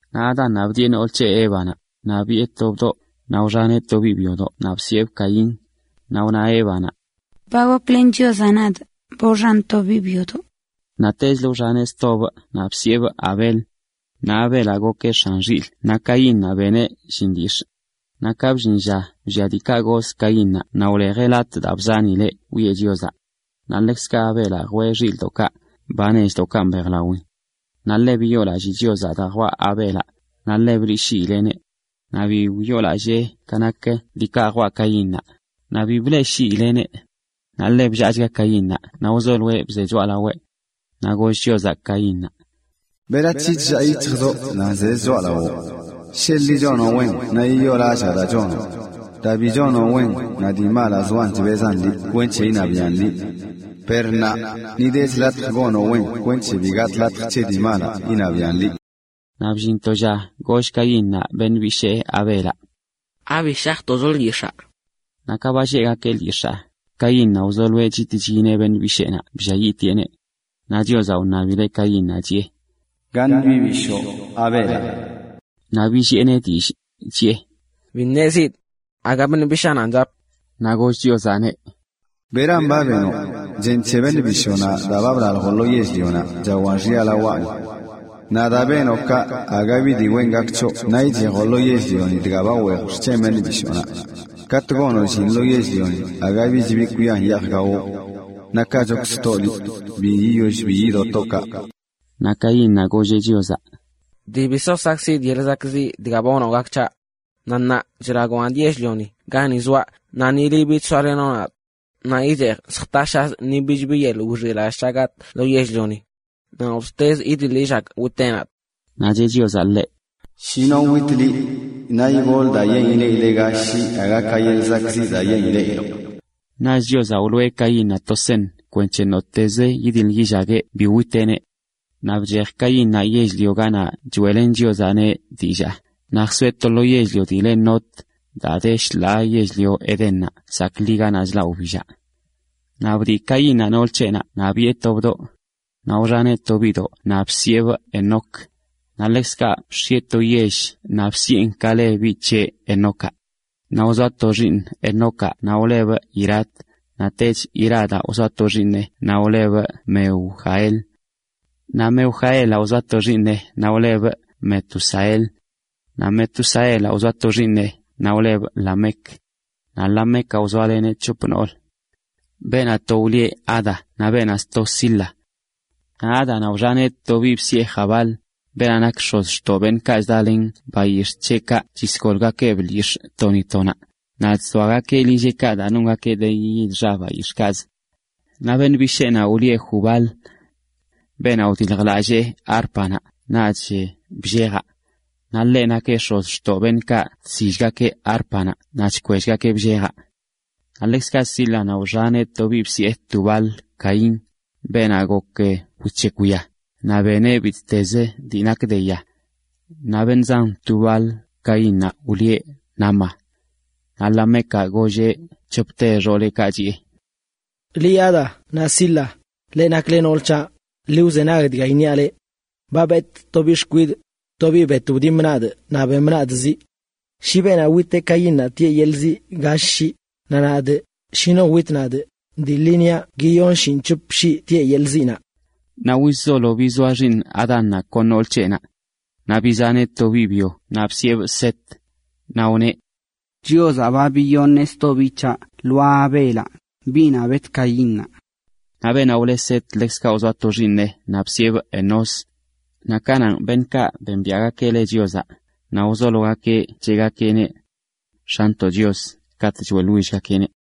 Naꞌ Adánnaꞌ bdiꞌe nool c̱heꞌ, Évanaꞌ, naꞌ biꞌe to bdoꞌ, naꞌ wxaneꞌ to biꞌ byodoꞌ naꞌ bsiꞌebꞌ Caín. Naꞌ wna Évanaꞌ: “Ba goklen Chiozaꞌ nadꞌ, ba wxanꞌ to biꞌ byodoꞌ.” Naꞌtechlə wxaneꞌ stobꞌ naꞌ bsiꞌebꞌ Abel. Naꞌ Abelaꞌ gokeꞌ x̱an xilꞌ naꞌ Caínnaꞌ beneꞌ llin lyix̱ꞌ. Naꞌ ka bllin lla wllia diikaꞌ goz Caínnaꞌ naꞌ jwee latꞌ daa bzanileꞌ wiꞌe Chiozaꞌ. Naꞌ ḻekzkaꞌ Abelaꞌ jwee xilꞌ nechdoꞌkaꞌ mbejlawin. Naꞌ ḻe biyoolallii Chiozaꞌ daa jwaꞌ Abelaꞌ, naꞌ ḻe bleꞌshiileꞌneꞌ. Naꞌ bi wyoolallee ka nak diikaꞌ jwaꞌ Caínnaꞌ, naꞌ bi bleꞌshiileꞌneꞌ. Naꞌ ḻe bllaachga Caínnaꞌ naꞌ bze choꞌalaweꞌ. Naꞌ goll Chiozaꞌ Caínnaꞌ: “¿Berac̱he chllaa yic̱hjzoꞌ naꞌ nzezə choꞌalawoꞌ? Sheḻꞌ liꞌ chonoꞌ wen naꞌ yiyoolallaa daa chonoꞌ. Daa bi chonoꞌ wen naꞌ dii malaꞌ zoan chbezan liꞌ kwenc̱he iṉabiaꞌn liꞌ. Per ṉaa ni dech latj gonoꞌ daa nak wen kwenc̱he bi gatꞌ latj c̱he dii malaꞌ iṉabiaꞌn liꞌ.” Naꞌ bllin to lla goll Caínnaꞌ beṉꞌ bishee Abelaꞌ: ―¿Abi shajtocho lyix̱aa? Naꞌ ka ba lleꞌgakeꞌ lyix̱aa, Caínnaꞌ wzoloeꞌ chit chyineꞌ beṉꞌ bisheenaꞌ blliayiꞌtieꞌneꞌ. Naꞌ Chiozaꞌ wṉabileꞌ Caínnaꞌ chiꞌe: ―¿Gaṉ biꞌ bishoo, Abelaꞌ? Naꞌ billiꞌeneꞌ dillꞌ, chiꞌe: ―Bi ṉezidꞌ. Aga biꞌ bishaananꞌ chapꞌ. Naꞌ goll Chiozaꞌneꞌ: ―¿Beran ba benoꞌ? Chen c̱he beṉꞌ bishoonaꞌ daa ba blaljoꞌ lo yell-lionaꞌ chawan xya lawaꞌni. Naꞌ daa benoꞌ kaꞌ aga bi dii wen gak c̱hoꞌ naꞌ ichejoꞌ lo yell-lioni dga ba weej xc̱hen beṉꞌ bishoonaꞌ. Katꞌ gonoꞌ llin lo yell-lioni aga bich bi kwian yeej gawoꞌ. Naꞌ kaꞌchokzə toꞌ liꞌ, bi yiyoll bi yido toꞌ kaꞌ. Naꞌ Caínnaꞌ golleꞌ Chiozaꞌ: ―Dii bi so sakꞌkziꞌdꞌ yeḻꞌ zakꞌziꞌ dga ba wnoꞌ gak c̱haꞌ. Naꞌ ṉaa chlagoꞌ nadꞌ yell-lioni gani zoaꞌ naꞌ ni liꞌ bich soalenoꞌ nadꞌ. Naꞌ ichejꞌ lljtashazꞌ ni bich bi yeḻꞌ wixilallꞌ c̱haꞌ gatꞌ lo yell-lioni. Naꞌ nottezə yidiḻ yillagꞌ witeꞌ nadꞌ. Naꞌ cheꞌ Chiozaꞌ ḻeꞌ: ―Shi no wit liꞌ, naꞌ igol daa yen ileꞌileꞌ gall shii aga ka yeḻꞌ zakꞌziꞌ daa yen ileꞌiloꞌ. Naꞌch Chiozaꞌ wloꞌe Caínnaꞌ to seṉ kwenc̱he nottezə yidiḻ yillagueꞌ bi witeꞌneꞌ. Naꞌ bchej Caínnaꞌ yell-lionaꞌ ganaꞌ choeꞌlen Chiozaꞌneꞌ dillaa, naꞌ jsoeꞌ to yell-lio dii le Nod, daa de shḻaa yell-lio Edénnaꞌ zaakli ganaꞌ chlaꞌlə wbillaꞌ. Naꞌ bdiꞌ Caínnaꞌ noolə c̱heꞌnaꞌ naꞌ biꞌe to bdoꞌ. Naꞌ wxaneꞌ to biꞌdoꞌ naꞌ bsiꞌebꞌ Enoc. Naꞌ ḻekzkaꞌ bx̱ieꞌ to yell naꞌ bsiꞌen Enoc ka le biꞌ c̱heꞌnaꞌ. Naꞌ wzoa to xiiṉ Enocaꞌ naꞌ wlebꞌ Irad. Naꞌtech Iradaꞌ wzoa to xiiṉeꞌ naꞌ wlebꞌ Mehujael. Naꞌ Mehujaelaꞌ wzoa to xiiṉeꞌ naꞌ wlebꞌ Metusael. Naꞌ Metusaelaꞌ wzoa to xiiṉeꞌ naꞌ wlebꞌ Lamec. Naꞌ Lamecaꞌ wzoaleneꞌ c̱hop nool. Beenaꞌ to wlieꞌ Ada naꞌ beenaꞌ sto, Zila. Naꞌ Ádanaꞌ wxaneꞌ to biꞌ bsiꞌe Jabal, beenaꞌ nak x̱ozxtoꞌ beṉꞌkaꞌ chdalen bayix̱ꞌ c̱heꞌkaꞌ chisgolgakeꞌb to ni to naꞌ, naꞌ chzoagakeꞌ lilleꞌkaꞌ daa nongakeꞌ de yid xa bayix̱ꞌkaꞌzə. Naꞌ beṉꞌ bisheenaꞌ wlieꞌ Jubal, beenaꞌ wdiljlallee árpanaꞌ naꞌch bllejaꞌ. Naꞌ ḻeꞌ nakeꞌ x̱ozxtoꞌ beṉꞌkaꞌ chsillgakeꞌ árpanaꞌ naꞌ chkwellgakeꞌ bllejaꞌ. Naꞌ ḻekzkaꞌ Zílanaꞌ wxaneꞌ to biꞌ bsiꞌe Tubal-caín, beenaꞌ gok wic̱hekw ya, naꞌ beneꞌ bittezə dii nak de ya. Naꞌ beṉꞌ zan Tubal-caínnaꞌ wlieꞌ Naama. Naꞌ Lamecaꞌ golleꞌ c̱hopte beṉꞌkaꞌ nak xooleꞌ: “Liꞌ Ada naꞌ Zila, leꞌ nakle nool c̱haꞌ, ḻi wzenag dga iṉiaꞌ leꞌ: ba betꞌ to biꞌ xkwidꞌ, to biꞌ bet wdimꞌ nadꞌ naꞌ bemꞌ nadꞌ ziꞌ. Shi beenaꞌ witeꞌ Caínnaꞌ tieꞌ yeḻꞌ ziꞌ gall shii, naꞌ nadꞌ, shi no wit nadꞌ, dii ḻi niaꞌ guiyon shinꞌc̱hop shii tieꞌ yeḻꞌ ziꞌnaꞌ.” Naꞌ wizzolo bizoa xiiṉ Adánnaꞌ kon nool c̱heꞌnaꞌ. Naꞌ bizaneꞌ to biꞌ byo naꞌ bsiꞌebꞌ Set, naꞌ wneꞌ: “Chiozaꞌ ba biyoṉeꞌ sto biꞌ c̱haꞌ lwaa Abelaꞌ, biꞌnaꞌ bet Caínnaꞌ.” Naꞌ beenaꞌ wleꞌ Set ḻekzkaꞌ wzoa to xiiṉeꞌ naꞌ bsiꞌebꞌ Enós. Naꞌ kananꞌ beṉꞌkaꞌ bembiaꞌgakeꞌ le Chiozaꞌ, naꞌ wzologakeꞌ cheꞌgakeꞌneꞌ “X̱anntoꞌ Chios” katꞌ choeꞌḻwillgakeꞌneꞌ.